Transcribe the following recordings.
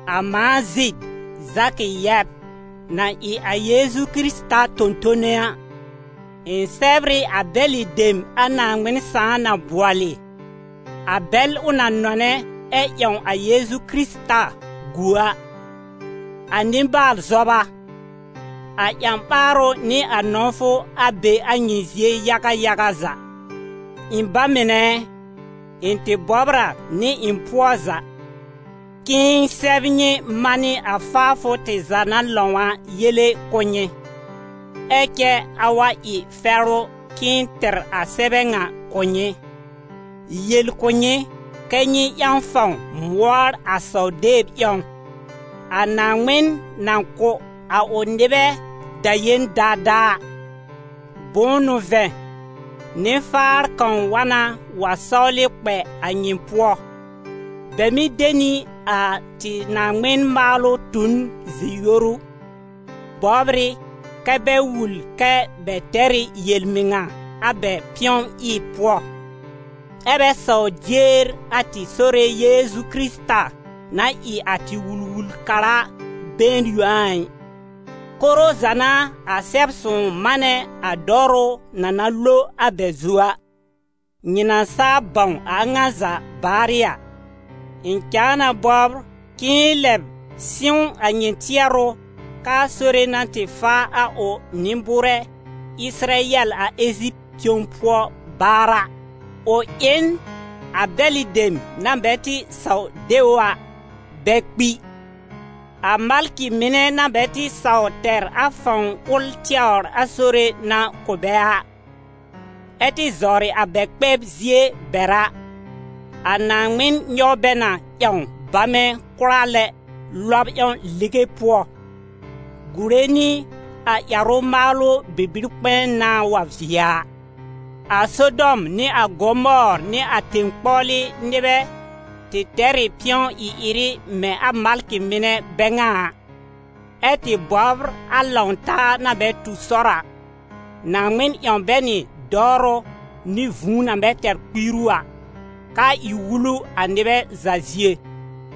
A mãa Zid, Zakɩ yɛb, na ɩ a Yeezu Kɩrɩta tõ-tõne a, ɩ̃ sɛbr ɩ a bɛlɩ dem a Naaŋmɩn Sãà na bʋɔlɩ, a bɛl ʋ na nɔnɛ ɛ ƴãw a Yeezu Kɩrɩta gu a. A nɩ-baal-zɔba, a ƴã-ɓaarʋ nɩ a nɔ̃wfʋ, a be a nyɩ zie yaga yaga za. Ɩ̃ ba mɩnɛ ɛ, ɩ̃ tɩ bɔbr a nɩ ɩ̃ pʋɔ za, k'ɩ̃ɩ sɛb nyɩ manɩ a faafʋ tɩ za na lãw a yele kʋ̀ nyɩ. Ɛ cɛ a wa ɩ fɛrʋ k'ɩ̃ɩ tɩr a sɛbɛ ŋa kʋ̀ nyɩ, yel kʋ̀ nyɩ kɛ́ nyɩ ƴãw fãw mʋɔr a saw-deb ƴãw, a Naaŋmɩn na kʋ̀ a ʋ nɩbɛ daƴẽn daadaa a. Bʋ̃ʋ n'ʋ vɛ̃, nɩ-faar kãw wa na wa sɔwlɩ kpɛ a nyɩ pʋɔ. Bɛ mɩ́ de nɩ a tɩ Naaŋmɩn-maalʋ tu n zi-yoru, bɔbr ɩ kɛ́ bɛ wul kɛ bɛ tɛr ɩ yel-mɩŋa a bɛ pɩ̃ɔ-ɩb pʋɔ, ɛ́ bɛ sawr dier a tɩ Sore Yeezu Kɩrɩta na ɩ a tɩ Wul-wul-kara been yõ a ɩ. Koro za n'a a Sɛb-sõw manɛ a dɔwrʋ na na lo a bɛ zu a. Nyɩ na saa bãw a a ŋa za baarɩ a, ɩ̃ cãa na bɔbr k'ɩ̃ɩ lɛb sɩ̃w a nyɩ tɩɛrʋ k'aa Sore na tɩ faa a ʋ nɩ-bʋʋrɛ Ɩsɩrayɛl a Eziptɩ tẽw pʋɔ baar a, ʋ ɩ n a bɛlɩ dem na bɛ tɩ saw de ʋ a, bɛ kpi. A malkɩ mɩnɛ na bɛ tɩ saw tɛr a fãw ʋl tɛwr a Sore na kʋ̀ bɛ a, ɛ́ tɩ zawrɩ a bɛ kpɛb zie bɛr a, a Naaŋmɩn nyɔw bɛ na ƴãw bamɛ kʋra lɛ lɔb ƴãw lige pʋɔ, gùre nɩ a ƴɛrʋ-maalʋ bibi-kpɛ̃ɛ nãá wa vɩɛ a. A Sodɔm nɩ a Gomɔɔr nɩ a tẽ-kpɔwlɩ nɩbɛ tɩ tɛr ɩ pɩ̃ɔ-ɩ-ɩrɩ mɛ̃ a malkɩ mɩnɛ bɛ ŋa a, ɛ́ tɩ bɔbr a lãw-taa na bɛ tu sɔr a, Naaŋmɩn ƴãw bɛ nɩ dɔwrʋ nɩ vũu na bɛ tɛr kpiiru a, k'aa ɩ wulu a nɩbɛ za zie.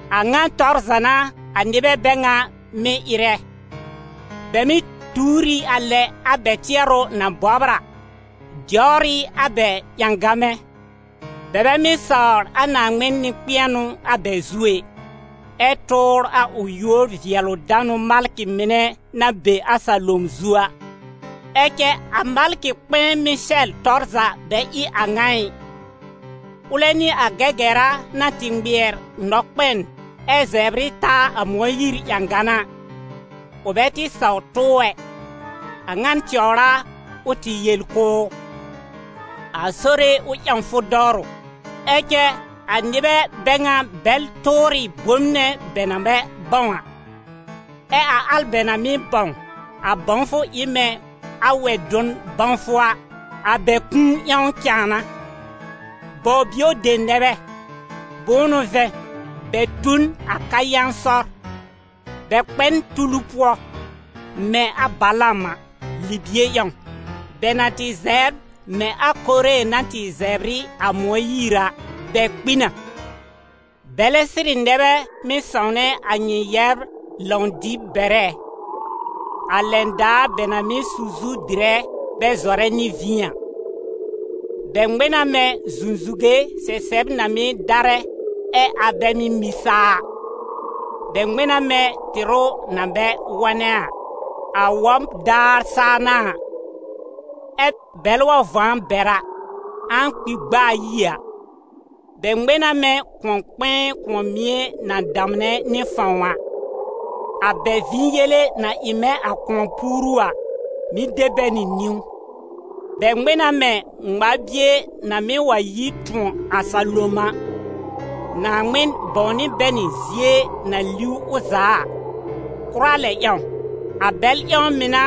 A ŋa tɔr za n'a a nɩbɛ bɛ ŋa mɩ̀ ɩrɛ: bɛ mɩ́ tuur ɩ a lɛ a bɛ tɩɛrʋ na bɔbr a, dɛwr ɩ a bɛ ƴãgamɛ; bɛ bɛ mɩ́ sawr a Naaŋmɩn nɩ-kpɛ̃ɛnʋ a bɛ zu ɛ, ɛ tʋʋr a ʋ yúor-vɩɛlʋ-danʋ malkɩ mɩnɛ na be a salom zu a. Ɛ cɛ a malkɩ-kpɛ̃ɛ Mɩsɛl tɔr za bɛ ɩ a ŋa ɩ. Ʋlɛ nɩ a Gɛgɛra na tɩ ŋmɩɛr nɔkpɛn ɛ zɛbr ɩ taa a Mõyiir ƴãgan a, ʋ bɛ tɩ saw tʋ ʋ ɛ. A ŋa tɛwr a ʋ tɩ yel kʋ̀ ʋ: «A Sore, ʋ ƴãw fʋ dɔwrʋ.» Ɛ cɛ a nɩbɛ bɛ ŋa bɛl tʋʋr ɩ bom nɛ bɛ na bɛ bãw a, ɛ a al bɛ na mɩ́ bãw, a bãwfʋ ɩ mɛ̃ a wɛ-dʋn bãwfʋ a, a bɛ kũu ƴãw cãa n'a. Baw-bio dem nɛ bɛ, bʋ̃ʋ n'ʋ vɛ̃, bɛ tu n a Kayɛ̃ sɔr; bɛ kpɛ n tulu pʋɔ mɛ̃ a Balaam a, libie ƴãw. Bɛ na tɩ zɛbr mɛ̃ a Koore na tɩ zɛb ɩ a Mõyiir a, bɛ kpi na. Bɛlɛ sɩrɩ nɛ bɛ mɩ́ sãwnɛ a nyɩ yɛbr lãw-dɩb bɛrɛ, a lɛn daar bɛ na mɩ́ su zu dɩrɛ bɛ zɔrɛ nɩ vĩ a. Bɛ ŋmɛ̃ na mɛ̃ zũzuwe sɛsɛb na mɩ́ darɛ, ɛ a bɛ mɩ́ mĩ saa a. Bɛ ŋmɛ̃ na mɛ̃ tɩrʋ na bɛ wɔnɛ a, a wɔb daar saa n'a a, ɛ bɛlɛ wa vɔ̃ a bɛr a, ãa kpi gb'a ayi a. Bɛ ŋmɛ̃ na mɛ̃ kʋ̃ɔ-kpɛ̃ɛ kʋ̃ɔ-mie na damnɛ nɩ fãw a, a bɛ vĩ yele na ɩ mɛ̃ a kʋ̃ɔ-puuru a, mɩ́ de bɛ nɩ niwn. Bɛ ŋmɛ̃ na mɛ̃ ŋmar-bie na mɩ́ wa yi tʋ̃ɔ a salom a; Naaŋmɩn bãwnɩ bɛ nɩ zie na liw ʋ za a, kʋra lɛ ƴãw. A bɛl ƴãw mɩ̀ n'a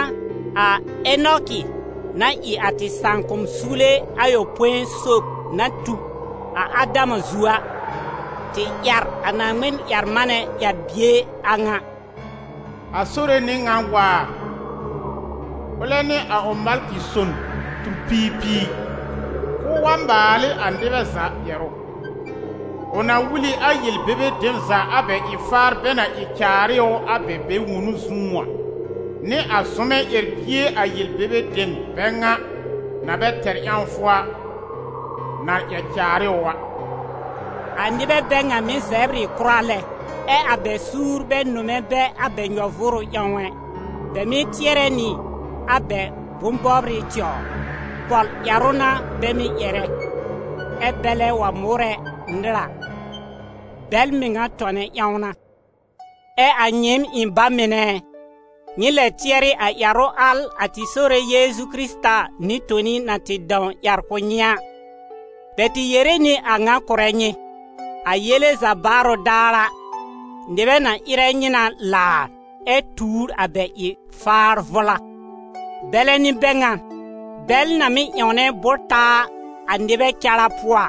a Enɔkɩ, na ɩ a tɩ sãakʋ̃-suwle ayopõi sob na tu a Adama zu a, tɩ ƴɛr a Naaŋmɩn-ƴɛr-manɛ ƴɛr-bie a ŋa: «A Sore n'ɩ ŋan waar, ʋlɛ nɩ a ʋ malkɩ-son tur-piir piir, k'ʋʋ wa maal ɩ a nɩbɛ za ƴɛrʋ. Ʋ na wul ɩ a yel-bebe dem za a bɛ ɩ-faar bɛ na ɩ caar ɩ ʋ a bɛ bɛ-wonu zũú a, nɩ a zʋmɛ ƴɛr-bie a yel-bebe dem bɛ ŋa, na bɛ tɛr ƴãwfʋ a, na ƴɛr caar ɩ ʋ a.» A nɩbɛ bɛ ŋa mɩ́ zɛbr ɩ kʋra lɛ, ɛ a bɛ suur bɛ nʋmɛ bɛ a bɛ nyɔ-vʋʋrʋ ƴãw ɛ. Bɛ mɩ́ tɩɛrɛ nɩ a bɛ bʋ̃-bɔbrɩ tɛwr. Pɔl-ƴɛrʋ n'a bɛ mɩ́ ƴɛrɛ, ɛ bɛlɛ wa mʋʋrɛ nɩr a, bɛl mɩŋa tɔnɛ ƴãw n'a. Ɛ a nyɩɩm, ɩ̃ ba mɩnɛ ɛ, nyɩ lɛ tɩɛrɩ a ƴɛrʋ al a tɩ Sore Yeezu Kɩrɩta nɩ-toni na tɩ dãw ƴɛr kʋ̀ nyɩ a. Bɛ tɩ yere nɩ a ŋa kʋrɛ nyɩ: «A yele za baarʋ daar a, nɩbɛ na ɩrɛ nyɩ na laar ɛ tuur a bɛ ɩ-faar vʋla.» Bɛlɛ n'ɩ bɛ ŋan, bɛl na mɩ́ ƴãwnɛ bʋ́r-taa a nɩbɛ cara pʋɔ a!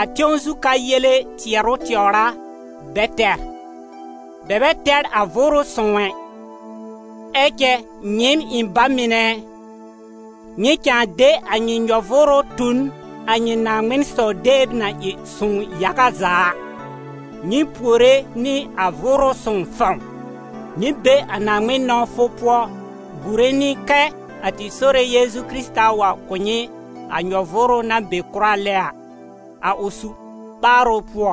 A tẽw zu ka yele tɩɛrʋ tɛwr a bɛ tɛr, bɛ bɛ tɛr a Vʋʋrʋ Sõw ɛ. Ɛ cɛ, nyɩɩm ɩ̃ ba mɩnɛ ɛ, nyɩ cãa de a nyɩ nyɔ-vʋʋrʋ tu n a nyɩ Naaŋmɩn-saw-deb na ɩ sõw yaga za a, nyɩ puore nɩ a Vʋʋrʋ Sõw fãw. Nyɩ be a Naaŋmɩn nɔ̃wfʋ pʋɔ gùre nɩ kɛ́ a tɩ Sore Yeezu Kɩrɩta wa kʋ̀ nyɩ a nyɔ-vʋʋrʋ na be kʋra lɛ a, a ʋ su-ɓaarʋ pʋɔ.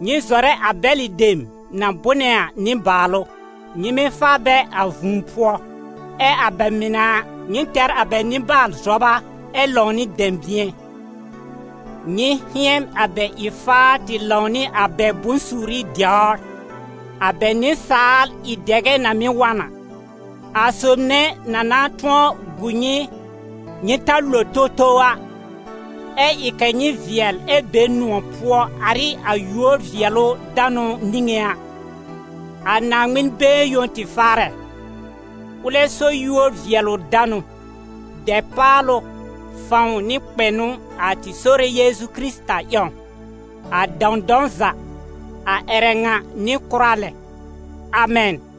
Nyɩ zɔrɛ a bɛlɩ dem na bʋ́nɛ a nɩ-baalʋ. Nyɩ mɩ́ faa bɛ a vũu pʋɔ; ɛ a bɛ mɩnɛ a, nyɩ tɛr a bɛ nɩ-baal-zɔba ɛ lãw nɩ dɛ̃bɩ̃ɛ. Nyɩ hɩ̃ɛn a bɛ ɩ-faar tɩ lãw nɩ a bɛ bʋ̃-suuri dɛwr, a bɛ nɩsaal ɩ-dɛgɛ na mɩ́ wa n a. A Sob nɛ na na tʋ̃ɔ gu nyɩ, nyɩ ta lo towtow a, ɛ́ ɩ kɛ̀ nyɩ vɩɛl ɛ be nʋ̃ɔ̀ pʋɔ ar ɩ a yúor-vɩɛlʋ-danʋ nĩŋé a, a Naaŋmɩn been yõ tɩ Faarɛ, ʋlɛ so yúor-vɩɛlʋ-danʋ, dɛpaalʋ, fãw nɩ kpɛnʋ a tɩ Sore Yeezu Kɩrɩta ƴãw, a dãwdãw za, a ƴɛrɛ ŋa nɩ kʋra lɛ. Amɛn.